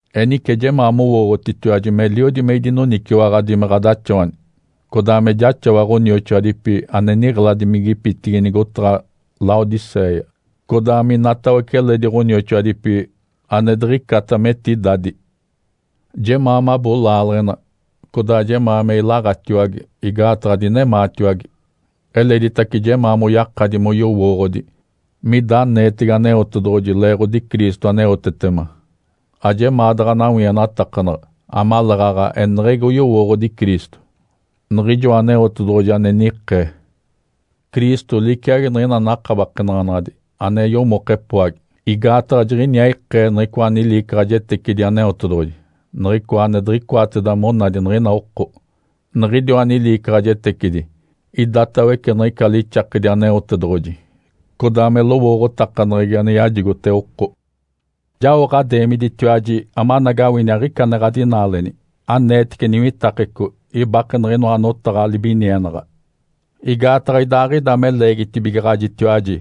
Enice jemaa mowooɡ̶otitiwaji meliodi me idinoniciwaɡ̶adi me ɡ̶adaxawani, codaa me jaxawa ɡ̶onioxoadipi ane niɡ̶eladimigipitigi nigotaɡ̶a Laodicéia, codaa minatawece eledi ɡ̶onioxoadipi ane diɡ̶icata me etidadi. Jemaa mabo laaleɡ̶ena, codaa jemaa me ilaɡ̶atiwage igaataɡ̶a dinemaatiwage. Eleditace jemaa moyakadi moyowooɡ̶odi mida aneetege Aneotedoɡ̶oji leeɡ̶odi Cristo aneotetema, ajemaa daɡ̶a nawienatakanaɡ̶a, amaleeɡ̶aɡ̶a eneɡ̶egi oyowooɡ̶odi Cristo, Niɡ̶ijoa Aneotedoɡ̶oji ane nikee. Cristo liciagi niɡ̶ina nakabakenaɡ̶anaɡ̶adi ane yomoke epoagi, igaataɡ̶a jiɡ̶iniaa ikee niɡ̶icoa niliicaɡ̶ajetecidi Aneotedoɡ̶oji, niɡ̶icoa ane diɡ̶icoateda monadi niɡ̶ina oko. Niɡ̶idiwa niliicaɡ̶ajetecidi idatawece niɡ̶ica lixakedi Aneotedoɡ̶oji, codaa me lowooɡ̶otakaneɡ̶egi ane yajigote oko. Jao ɡ̶adeemiditiwaji amanagawini aɡ̶ica ane ɡ̶adinaaleni, aneetece niwitakeco, ibake niɡ̶inoa notaɡ̶a libinienaɡ̶a. Igaataɡ̶a idaaɡ̶ida me leegitibigaɡ̶ajitiwaji,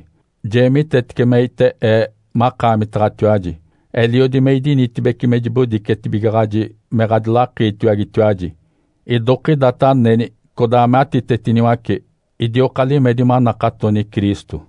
jeemitetece meite ee makaamitaɡ̶atiwaji, eliodi me idinitibeci me jibodicetibigaɡ̶aji me ɡ̶adilakiitiwagetiwaji, idokidata aneni, codaa me atitetiniwace, idioka limedi manakatoni Cristo.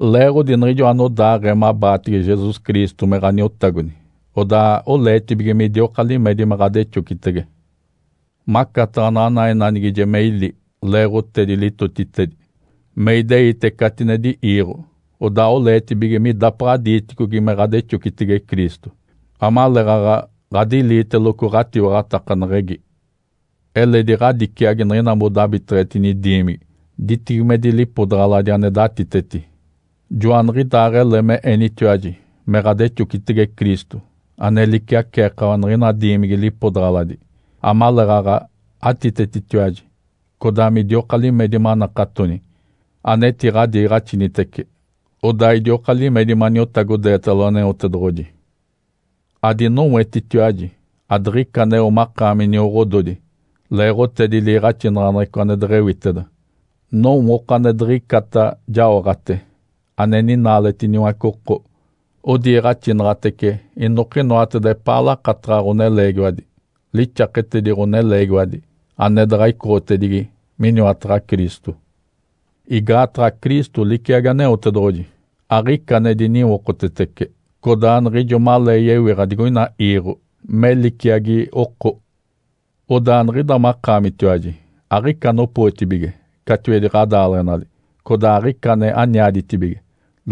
Leeɡ̶odi niɡ̶ijo anodaaɡ̶ee mabaatege Jesus Cristo me Ǥaniotagodi, odaa oleetibige midioka limedi me ɡ̶adexocitege. Macataɡ̶a naɡ̶ana enanigije me ili leeɡ̶otedi litotitedi me ideite catinedi iiɡ̶o, odaa oleetibige midapaɡ̶a diiticogi me ɡ̶adexocitege Cristo, amaleeɡ̶aɡ̶a ɡ̶adiliiteloco ɡ̶atiwaɡ̶atakaneɡ̶egi. Eledi ɡ̶adiciagi niɡ̶ina modabiteɡ̶etini diimigi ditibigimedi lipodaɡ̶aladi ane datiteti, joaniɡ̶idaaɡ̶ele me enitiwaji me ɡ̶adexocitege Cristo ane liciaceekawa niɡ̶ina diimigi lipodaɡ̶aladi, amaleeɡ̶aɡ̶a atitetitiwaji codaa midioka limedi manakatoni, anetiɡ̶adiiɡ̶axinitece. Odaa idioka limedi maniotagodeetalo Aneotedoɡ̶oji. Adinowetitiwaji adiɡ̶ica aneo makaami nioɡ̶ododi leeɡ̶otedi liiɡ̶axinaɡ̶aneɡ̶eco ane deɡ̶ewiteda, nowooko ane diɡ̶icata jaoɡ̶ate, ane ninaaletiniwace oko. Odiiɡ̶axinaɡ̶atece inokinoateda epaa lakataɡ̶a ɡ̶oneleegiwadi, lixaketedi ɡ̶oneleegiwadi, ane daɡ̶a icoɡ̶otedigi miniwataɡ̶a Cristo. Igaataɡ̶a Cristo liciagi Aneotedoɡ̶oji, aɡ̶ica ane diniwokotetece, codaa niɡ̶ijo malee yewiɡ̶a digoina iiɡ̶o me liciagi oko. Odaa niɡ̶ida makaamitiwaji aɡ̶ica anopootibige catiwedi ɡ̶adaaleɡ̶enali codaa aɡ̶ica ane aniaditibige,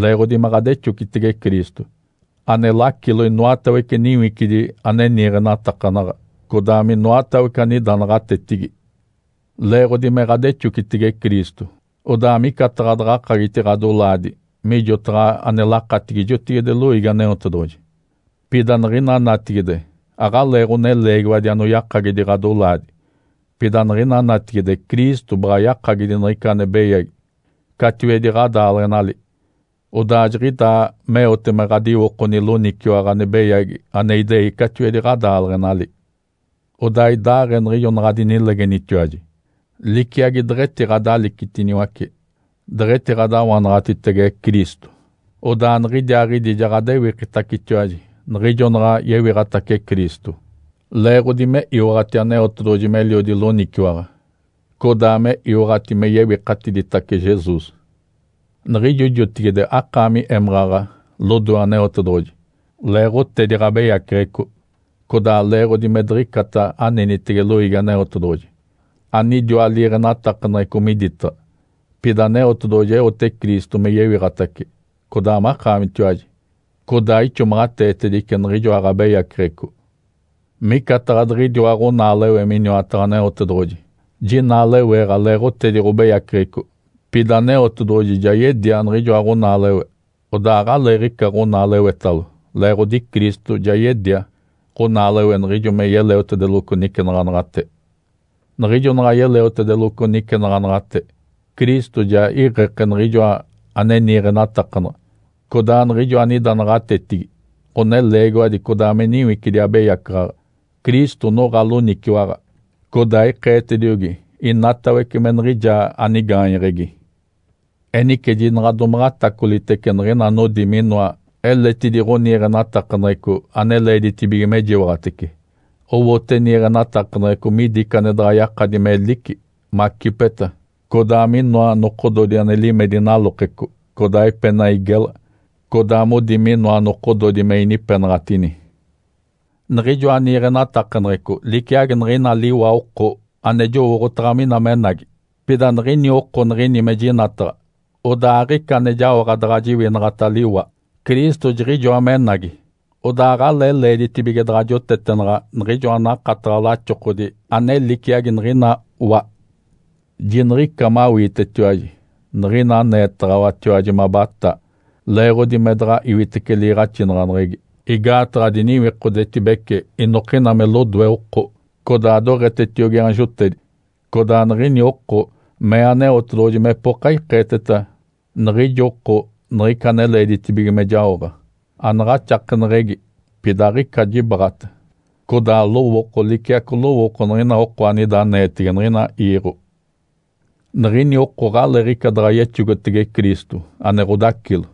leeɡ̶odi me ɡ̶adexocitege Cristo, ane lacilo inoatawece niwicidi ane niiɡ̶enatakanaɡ̶a, codaa minoatawece anida naɡ̶atetigi. Leeɡ̶odi me ɡ̶adexocitege Cristo, odaa micataɡ̶a daɡ̶akagiti ɡ̶adolaadi mijotaɡ̶a ane lakatigi jotigide loiigi Aneotedoɡ̶oji. Pida niɡ̶ina natigide aɡ̶alee ɡ̶oneleegiwadi anoyakagidi ɡ̶adolaadi, pida niɡ̶ina natigide Cristo baɡ̶a yakagidi niɡ̶ica ane beyagi catiwedi ɡ̶adaaleɡ̶enali. Odaa jiɡ̶idaa meote me ɡ̶adiwokoni loniciwaɡ̶a ane beyagi ane idei catiwedi ɡ̶adaaleɡ̶enali. Odaa idaaɡ̶ee niɡ̶ijo naɡ̶adinilegenitiwaji, liciagi deɡ̶etiɡ̶adalicitiniwace, deɡ̶etiɡ̶adawanaɡ̶atitege Cristo, odaa niɡ̶idiaaɡ̶idi ja ɡ̶adewikitacetiwaji niɡ̶ijo naɡ̶a yewiɡ̶atace Cristo, leeɡ̶odi me iwaɡ̶ati Aneotedoɡ̶oji meliodi loniciwaɡ̶a, codaa me iwaɡ̶ati me yewikatiditace Jesus. Niɡ̶ijo jotigide akaami émaɡ̶aɡ̶a lodoe Aneotedoɡ̶oji leeɡ̶otedi ɡ̶abeyaceɡ̶eco, codaa leeɡ̶odi me diɡ̶icata anenitege loiigi Aneotedoɡ̶oji, anidiwa liiɡ̶enatakaneɡ̶eco miditaɡ̶a. Pida Aneotedoɡ̶oji eote Cristo me yewiɡ̶atace, codaa makaamitiwaji. Codaa ixomaɡ̶ateetedice niɡ̶ijoa ɡ̶abeyaceɡ̶eco. Micataɡ̶a diɡ̶idiwa ɡ̶onaalewe miniwataɡ̶a Aneotedoɡ̶oji, jinaaleweeɡ̶a leeɡ̶otedi ɡ̶obeyaceɡ̶eco. Pida Aneotedoɡ̶oji ja yedia niɡ̶ijoa ɡ̶onaalewe, odaa aɡ̶aleeɡ̶ica ɡ̶onaalewetalo, leeɡ̶odi Cristo ja yedia ɡ̶onaalewe niɡ̶ijo me yeleotedeloco nicenaɡ̶anaɡ̶ate. Niɡ̶ijo naɡ̶a yeleotedeloco nicenaɡ̶anaɡ̶ate, Cristo ja iɡ̶eke niɡ̶ijoa ane niiɡ̶enatakanaɡ̶a, codaa niɡ̶ijo anida naɡ̶atetigi (ɡ̶oneleegiwadi codaa me niwicidi abeyacaɡ̶aɡ̶a). Cristo noɡ̶a loniciwaɡ̶a, codaa ikeetediogi inatawece me niɡ̶ijaa anigaanyeɡ̶egi. Enice jinaɡ̶a domaɡ̶a atacolitece niɡ̶ina anodi minoa eletidi ɡ̶oniiɡ̶enatakaneɡ̶eco ane leeditibige mejiwaɡ̶atece. Owote niiɡ̶enatakaneɡ̶eco midi ica ane daɡ̶akati melici, macipeta, codaa minoa nokododi ane limedi nalokeco, codaa epenai gela, codaa modi minoa nokododi me inipenaɡ̶atini. Niɡ̶ijoa niiɡ̶enatakaneɡ̶eco liciagi niɡ̶ina liwa oko ane jowooɡ̶otaɡ̶a mina menagi. Pida niɡ̶ini oko niɡ̶ini mejinataɡ̶a, odaa aɡ̶ica ane jaoɡ̶a daɡ̶a jiwinaɡ̶ata liwa. Cristo jiɡ̶ijoa menagi, odaa aɡ̶alee leeditibige daɡ̶a jotetenaɡ̶a niɡ̶ijoa nakataɡ̶a laxokodi ane liciagi niɡ̶inoa wa. Jiniɡ̶ica mawiitetiwaji niɡ̶ina aneetaɡ̶awatiwaji mabataa, leeɡ̶odi me daɡ̶a iwitece liiɡ̶axinaɡ̶aneɡ̶egi, igaataɡ̶a diniwikodetibece inokina me lodoe oko, codaa doɡ̶etetiogi aanjotedi. Codaa niɡ̶ini oko mee Aneotedoɡ̶oji mepoka ikeeteta niɡ̶ijo oko niɡ̶ica ane leeditibige me jaoɡ̶a. Anaɡ̶axakeneɡ̶egi, pida aɡ̶ica jibaɡ̶ata, codaa lowooko liciaco lowooko niɡ̶ina oko anida aneetege niɡ̶ina iiɡ̶o. Niɡ̶ini oko aɡ̶aleeɡ̶ica daɡ̶a yexogotege Cristo ane ɡ̶odacilo.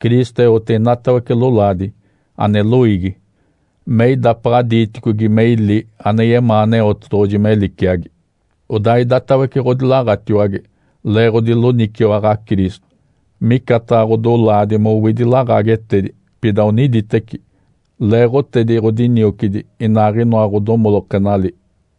Cristo eote inatawece lolaadi, ane loiigi, me idapaɡ̶a diiticogi me ili ane yemaa Aneotedoɡ̶oji me liciagi. Odaa idatawece ɡ̶odilaɡ̶atiwage leeɡ̶odi loniciwaɡ̶a Cristo, micataɡ̶a ɡ̶odolaadi mowidi laɡ̶aagetedi, pida oniditeci, leeɡ̶otedi ɡ̶odiniocidi inaaɡ̶inoa ɡ̶odomolokenali.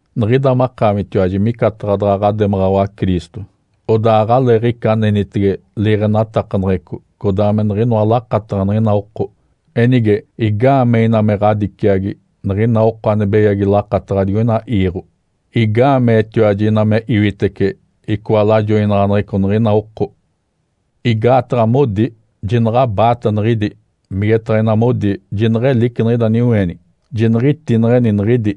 Niɡ̶ida makaamitiwaji micataɡ̶a daɡ̶a ɡ̶ademaɡ̶awa Cristo. Odaa aɡ̶aleeɡ̶ica anenitege liiɡ̶enatakaneɡ̶eco, codaa me niɡ̶inoa lakataɡ̶a niɡ̶ina oko. Enige, igaamee ina me ɡ̶adiciagi niɡ̶ina oko ane beyagi lakataɡ̶a digoina iiɡ̶o? Igaameetiwaji ina me iwitece icoa lajoinaɡ̶aneɡ̶eco niɡ̶ina oko? Igaataɡ̶a modi, “Jinaɡ̶abaata niɡ̶idi!”, migetaɡ̶a ina modi, “Jineɡ̶elici niɡ̶ida niweenigi!”, “Jiniɡ̶itineɡ̶eni niɡ̶idi!”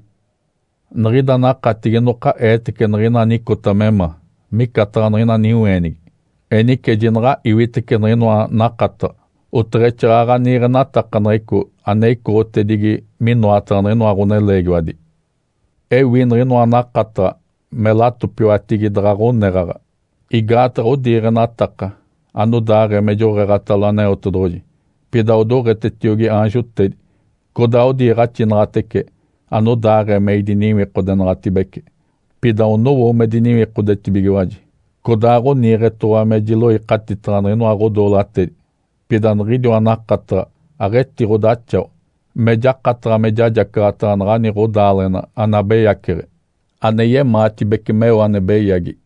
Niɡ̶ida nakatigi inoka eetece niɡ̶ina anicota me ma, micataɡ̶a niɡ̶ina niweenigi. Enice jinaɡ̶a iwitece niɡ̶inoa nakataɡ̶a oteɡ̶exaaɡ̶aɡ̶a niiɡ̶enatakaneɡ̶eco ane icoɡ̶otedigi minoataɡ̶a niɡ̶inoa ɡ̶oneleegiwadi. Ewi niɡ̶inoa nakataɡ̶a me latopiwatigi daɡ̶a ɡ̶oneɡ̶aɡ̶a, igaataɡ̶a odiiɡ̶enataka anodaaɡ̶ee me joɡ̶eeɡ̶atalo Aneotedoɡ̶oji, pida odoɡ̶etetiogi aanjotedi, codaa odiiɡ̶axinaɡ̶atece anodaaɡ̶ee me idiniwikodenaɡ̶atibece, pida onowo me diniwikodetibigiwaji, codaa ɡ̶oniiɡ̶etoɡ̶owa me jiloikatitaɡ̶a niɡ̶inoa ɡ̶odoolatedi. Pida niɡ̶idiwa nakataɡ̶a aɡ̶etiɡ̶odaxawa me jakataɡ̶a me jajacaɡ̶ataɡ̶a naɡ̶ani ɡ̶odaaleɡ̶ena anabeyaceɡ̶e ane yemaatibece meo ane beyagi.